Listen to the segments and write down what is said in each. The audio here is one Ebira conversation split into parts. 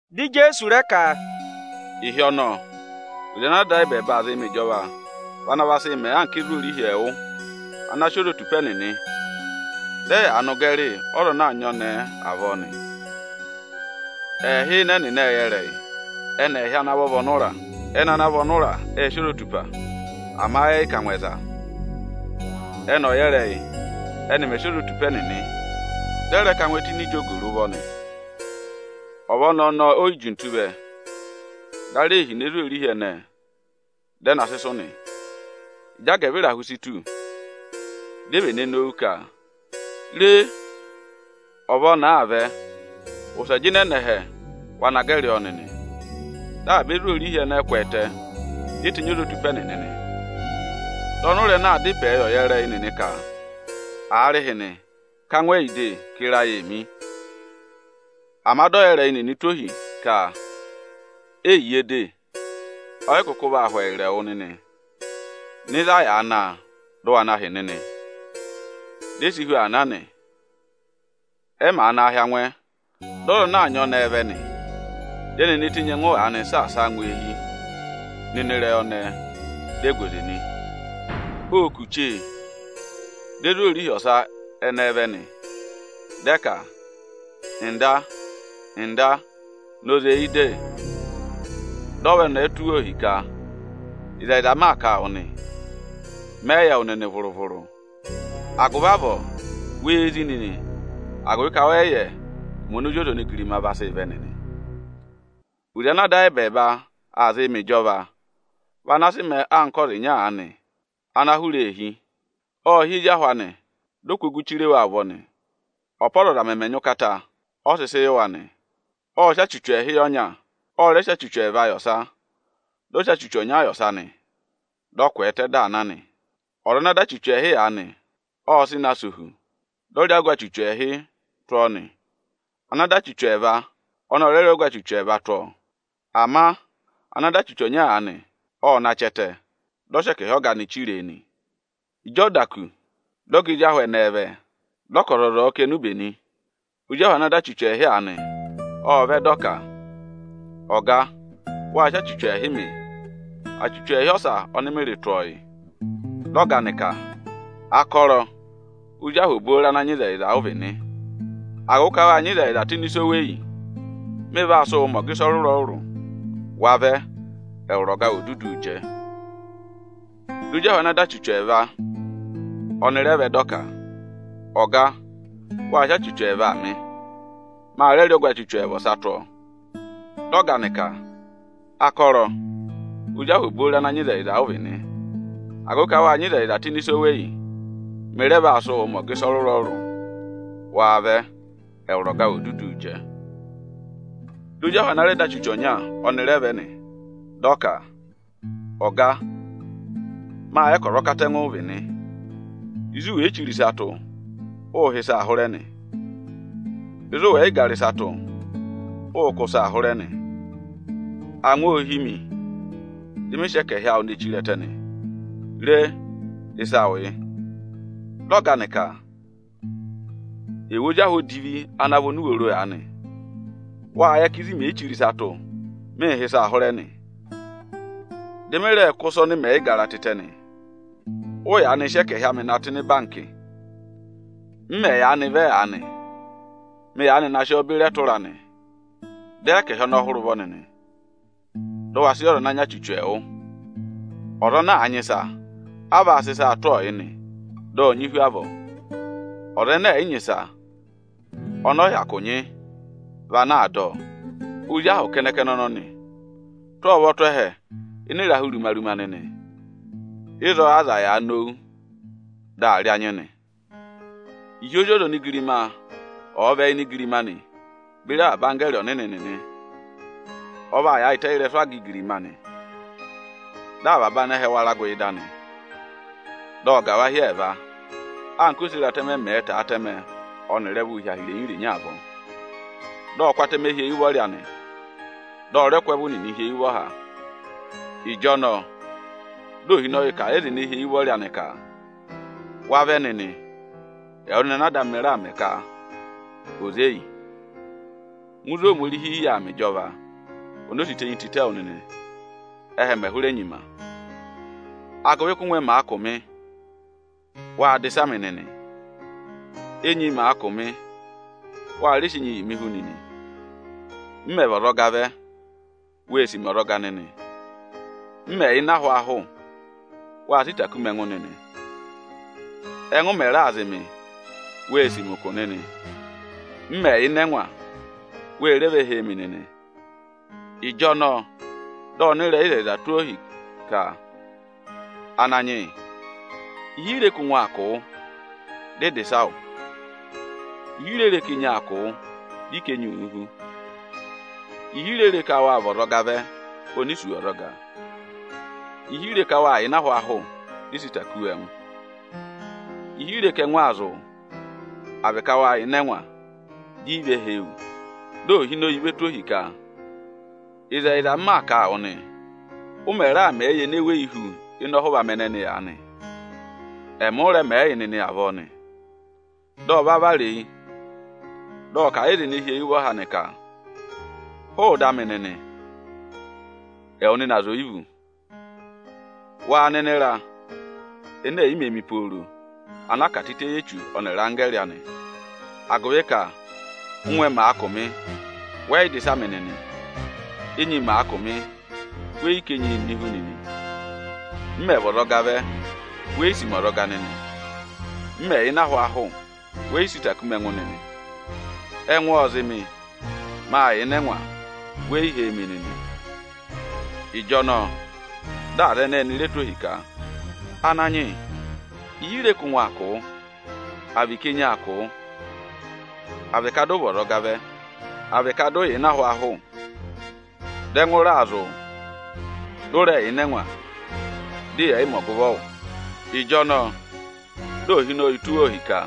Dị Ijeesu rẹ ka, “Ịhị ọnọọ, oze ana Ada ayị ẹbẹẹba aa zịị mẹ ịjọva vị ana va sị mẹẹ anka ezwoorihi ẹẹwụ ana sị ozotupa ẹnịnị, dị ẹyaa nọ ụgẹrị ọza ana aa nyị ọnẹẹ avọọ. Ẹẹhị ịnị ẹnịnị ệ yẹ ịrẹyị; ẹnị ẹẹhị ana vọ vị ọnụra. Ẹnị ana vị ọnụra ệ sị ozotupa, ama ẹ yị ká angwẹ za. Ẹ́nị ọyẹrẹyị ẹnị mẹ̀ sị ozotupa ẹnịnị, dị ẹ rẹ ká angwẹ tụ́ ini ijogo rị ụvọ nị. Ọva ọnẹẹ ọnọọ o yi jintu vẹ, dị ara ee hine ezwoorihi ẹnẹẹ, dị ẹ na sị sụ̀ nị. Ịjị agẹvịrahụ si tù, di e vene nowu ka: ‘Re! Ọva ọnẹẹ aa vẹ, wụsẹ jịnẹ nọ ẹhẹ, wa na gẹrị ọọ nịnị!’ Dị avaba ezwoorihi ẹnẹẹ kwẹẹtẹ, di e tenyi ozotupa ẹnịnị nị. Dị ọnụra ẹnẹẹ aa dá ịpẹẹ yị ọyẹrẹyị nịnị ka: ‘Aarịhịnị, ká angwẹ yị de, ka ịra ayị ee mi!’ Ama dị ọyẹrẹyị nịnị tụ́ ohi ka: ‘Eyiye de, ọ yị kụkụ vaa hụ ẹyịrị ẹwụ nịnị. Nọ ịzị a yàā ná a, dị ụ wa na hị́ nịnị!’ Di e si hu aa na nị. Ẹ màa naa hị́ angwẹ, dị ọza ana aa nyị ọnẹẹ vẹ nị. Dị ẹnị ene tenyi ẹngụ aanị saasa a ngụ eehi nọ ini ịrẹyị ọnẹẹ, di e gu oze nị. Ô kù chee, di ezwoorihi ọsa ẹnẹẹ vẹ nị. Dị ẹ ka: ‘Ọga, Ọga, na oze yị de!’ Dị ọva ọnẹẹ ọnọọ tụ́ wa ohi ka: ‘Ịzẹyịza m maa kà nị, mẹ yị yẹ wụ nịnị vụrụ-vụrụ.’ Agụvị avọọ, wee zí nịnị, agụvị ka wẹ yị yẹ ụmẹ oni Ozi ọza onigirima vaa sị vẹ nịnị.” “Oze ana Ada ayị ẹbẹẹba aa zịị mẹ ịjọva vị ana sị mẹẹ anka ọza ịnya aanị ana aa hụrẹ eehi. Ộ hị́ ezi ahụ anị, dị ọ kụ́ ogu chire wa ụvọ nị. Ọ́pa ọzọza mẹmẹ nyị ụkata, ọ sị sị yị wa nị. Ộ sị achuchu ẹẹhị yị ọza ọnya, ọ rẹ sị achuchu ẹẹva yị ọsa, dị ọ sị achuchu ọnya yị ọsa nị. Dị ọ kwẹẹtẹ, dị aa na nị. Ọza ana dọ achuchu ẹẹhị aanị, ộ sị na sẹ ohu, dị ọ rẹ rị ọgụ achuchu ẹẹhị tụ́ ọ nị. Ana dọ achuchu ẹẹva, ọnị ọ rẹ rị ọgụ achuchu ẹẹva tụ́ ọọ. Ama ana dọ achuchu ọnya aanị, ọ na chị ẹtẹ, dị ọ sị ẹkẹhị ọga anị chire e nị. Ịjị ọ da kù, dị ọga ezi ahụ ẹnẹẹ vẹ, dị ọ ka ọzọza ọ̀ọ kà enube nị. Ozi ahụ ana dọ achuchu ẹẹhị aanị, ộ vẹ dị ọ ka: ‘Ọga, wâ sị achuchu ẹẹhị mị, achuchu ẹẹhị ọsa ọnị mị rị tụ́ ọ yị.’ Dị ọga anị ka: ‘Akọrọ! Ozi ahụ obooro ana nyị ịzẹyịza ụ vị nị. Agụvị ka wâ nyị ịzẹyịza tụ́ ịnị ịsa oweyi, mị vaa sị wụụ mẹ ọga ịsa ọrụrụ-ọrụrụ. Wa vẹ, ẹwụrị ọga awụ ò duduu jẹ!’ Dị ozi ahụ ana dọ achuchu ẹẹva, ọnị rẹ vẹ, dị ọ ka: ‘Ọga, wâ sị achuchu ẹẹva mị; ma rẹ rị ọgụ achuchu ẹẹva ọsa tụ́ ọọ.’ Dị ọga anị ka: ‘Akọrọ! Ozi ahụ obooro ana nyị ịzẹyịza ụ vị nị. Agụvị ka wâ nyị ịzẹyịza tụ́ ịnị ịsa oweyi, mị rẹ vaa sị wụụ mẹ ọga ịsa ọrụrụ-ọrụrụ. Wa vẹ, ẹwụrị ọga awụ ò duduu jẹ!’ Dị ozi ahụ ana rẹ dọ achuchu ọnya, ọnị rẹ vẹ nị. Dị ọ ka: ‘Ọga, mâ yẹ ka ọza ọkatẹngụ ụ vị nị; ịzị u wè yi chire ịsa tụ́, ụụ̄ há ịsaa hụrẹ nị. Ịzị ụ wẹ̀ yị gara ịsa tụ́, ụụ̄ kụ́ ịsaa hụrẹ nị. Angwa ô hí mi, dị mị sị ẹkẹhị awụ ne chire ẹtẹ nị. Re, ịsa awụ yị.’ Dị ọga anị ka: ‘Ẹwụ ozi ahụ odivi ana vị onuworo aanị!’ Wâ yẹ ka ịzị mè yi chire ịsa tụ́, mịị̄ há ịsaa hụrẹ nị; dị mị rẹẹ̄ kụ́ ịsa ọnị mẹ̀ yị gara tịtẹ nị. Ụ́ yaanị sị ẹkẹhị amị na tụ́ ịnị ịbankị nị; m mẹ̀ yaanị vẹ aanị, dị mị yaanị na sị ọọ beri ẹtụra anị. Dọ ẹkẹhị ọnọọ hụrẹ ẹ ụvọ nịnị, dị ụ wa sị yị ọza ana nyị achuchu ẹẹwụ! Ọza ana àa nyị ịsa, a vaa sị ịsaa tụ́ ọọ yị nị, dị ọ̀ nyị hu avọọ. Ọza ẹnẹ ẹ̀ yị nyị ịsa, ọnị ọ̀ọ hyakụ nyị vị ana aa dọ ọ. Ozi ahụ kẹnẹ-kẹnẹ ọnọnị, tụ́ ọ ụvọ tụ́ ẹhẹ ịnị ịrahụ ruma-ruma nịnị, ịzọọ ázaā yàa nowu, dị aa rị anyị nị.” “Ịhị Ozi ọza onigirima ọ̀ọ vẹ ini igirima anị beri avaba anggẹẹrị ọnịnị nịnị, ọ vaa yaayịtẹ ị́rẹsụ aga igirima anị. Dị avaba anẹhẹ wara gụ ịda anị, dị ọ gà wa hi ẹẹva, anka oseratẹmẹ mẹ̀ẹ̄ tọ̀ọ́ atẹmẹ ọnịrị ẹvụụ hi aha irenyi-irenyi avọọ. Dị ọ kụ́ atẹmẹ hi eyi ụvọrị anị, dị ọ rẹ kụ́ ẹvụ nịnị hi eyi ụvọha. Ịjọnọọ dị Ohinọyị kà a yị aza ene hi eyi ụvọrị anị ka: ‘Wa vẹ nịnị, ẹwụ nịnị ana Ada amị raà mẹ ka ò zé yị! Ngụ ịzị Ohomorihi yà aa mẹ ịjọva, oni o si tenyi tịtẹ wụ nịnị, ẹ́hẹ mè hụrẹ nyima. Agụvị ka ụ́ngwẹ màa kụ̀ mị, wâ dà ịsa mị nịnị. Ónyi màa kụ̀ mị, wa rẹ sị enyi yị mị hú nịnị. M mẹ̀ vị ọzọga vẹ, wê sì mi ọzọga nịnị. M mẹ̀ yà ịnị ahwaahụ, wâ sị ịta kú mi ẹngụ nịnị. Ẹ́ngụ mẹ̀ raa zị mị, wê sì mi ụkụ nịnị. M mẹ̀ yà ịnị ẹngwa, we re ve hee mi nịnị.’ Ịjọnọọ dị ọnịrẹyịzẹyịza nịnị tụ́ ọ ohi ka: ‘Ananyị yị, ịhị i re ka ụngwẹ aa kụ̀ wụ, dị ị dà ịsa wụ? Ịhị i re re ka enyi aa kụ̀ wụ, dị ị ká enyi wu hú? Ịhị i re re ka wa vị ọzọga vẹ oni i sì wu ọzọga? Ịhị i re ka wâ yà ịnị ahwaahụ, dị ị sị ịta kú wu ẹngụ? Ịhị i re ka ẹngụ aa zị wụ, à vị ka wâ yà ịnị ẹngwa, di i ve hee wu?’ Dị Ohinọyị vee tụ̀ ohi ka: ‘Ịzẹyịza, m maa kà a wụ nịnị nị, ụ mẹ̀ raà mẹẹ yị ene weyi hu ịnị ọhụva amị ẹnẹnị aanị, ẹmị ụ rẹ mẹẹ yị nịnị avọọ nị.’ Dị ọ va vara eyi, dị ọ kà a yị aza ene hi eyi ụvọha anị ka: ‘Hụụ ịda amị nịnị, ẹwụ nịnị aza oyivu! Waa nọ ịnị ịra ene è yi mē mi pooro, ana a kà tịtẹ yị Echu ọnịrị anggẹẹrị anị. Agụvị ka, ụ́ngwẹ màa kụ̀ mị, wẹ yị dà ịsa mị nịnị. Ónyi màa kụ̀ mị, wẹ yị ká enyi mị hú nịnị. M mẹ̀ vị ọzọga vẹ, we yi sì mi ọzọga nịnị. M mẹ̀ yà ịnị ahwaahụ, wẹ yị sị ịta kú mi ẹngụ nịnị. Ẹngụ ộ zị mị, mâ yà ịnị ẹngwa, we yi hee mi nịnị.’ Ịjọnọọ dị aza ẹnẹẹ ẹnị re tụ́ ohi ka: ‘Ananyị yị, ịhị i re ka ụngwẹ aa kụ̀ wụ, à vị ka enyi aa kụ̀ wụ, à vị ka dị ụ vị ọzọga vẹ, à vị ka dị ụ yà ịnị ahwaahụ, dị ẹngụ raa zị wụ, dị ụ rẹ yà ịnị ẹngwa, dị yẹ̀ yị mẹ ọgụvọ wụ?’ Ịjọnọọ dị Ohinọyị tụ́ wa ohi ka: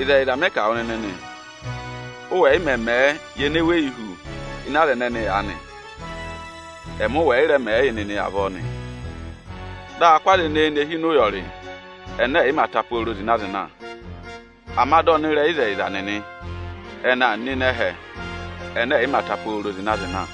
‘Ịzẹyịza mị kà wụ nịnị nị, ụ wẹ̀ yị mẹ mẹ̀ ẹ yị ene weyi hu ịnị aza ẹnẹnị aanị, ẹmị ụ wẹ̀ yị rẹ mẹ̀ ẹ yị nịnị avọọ nị.’ Dị aa kụ́ aza ẹnẹẹ ne hi ịnị ụyọrị ẹnẹ ẹ̀ yị mā ta pooro zịna-zịna, ama dị ọnịrẹyịzẹyịza nịnị ẹnị aa nọ ịnị ẹhẹ ẹnẹ ẹ̀ yị mā ta pooro zịna-zịna.”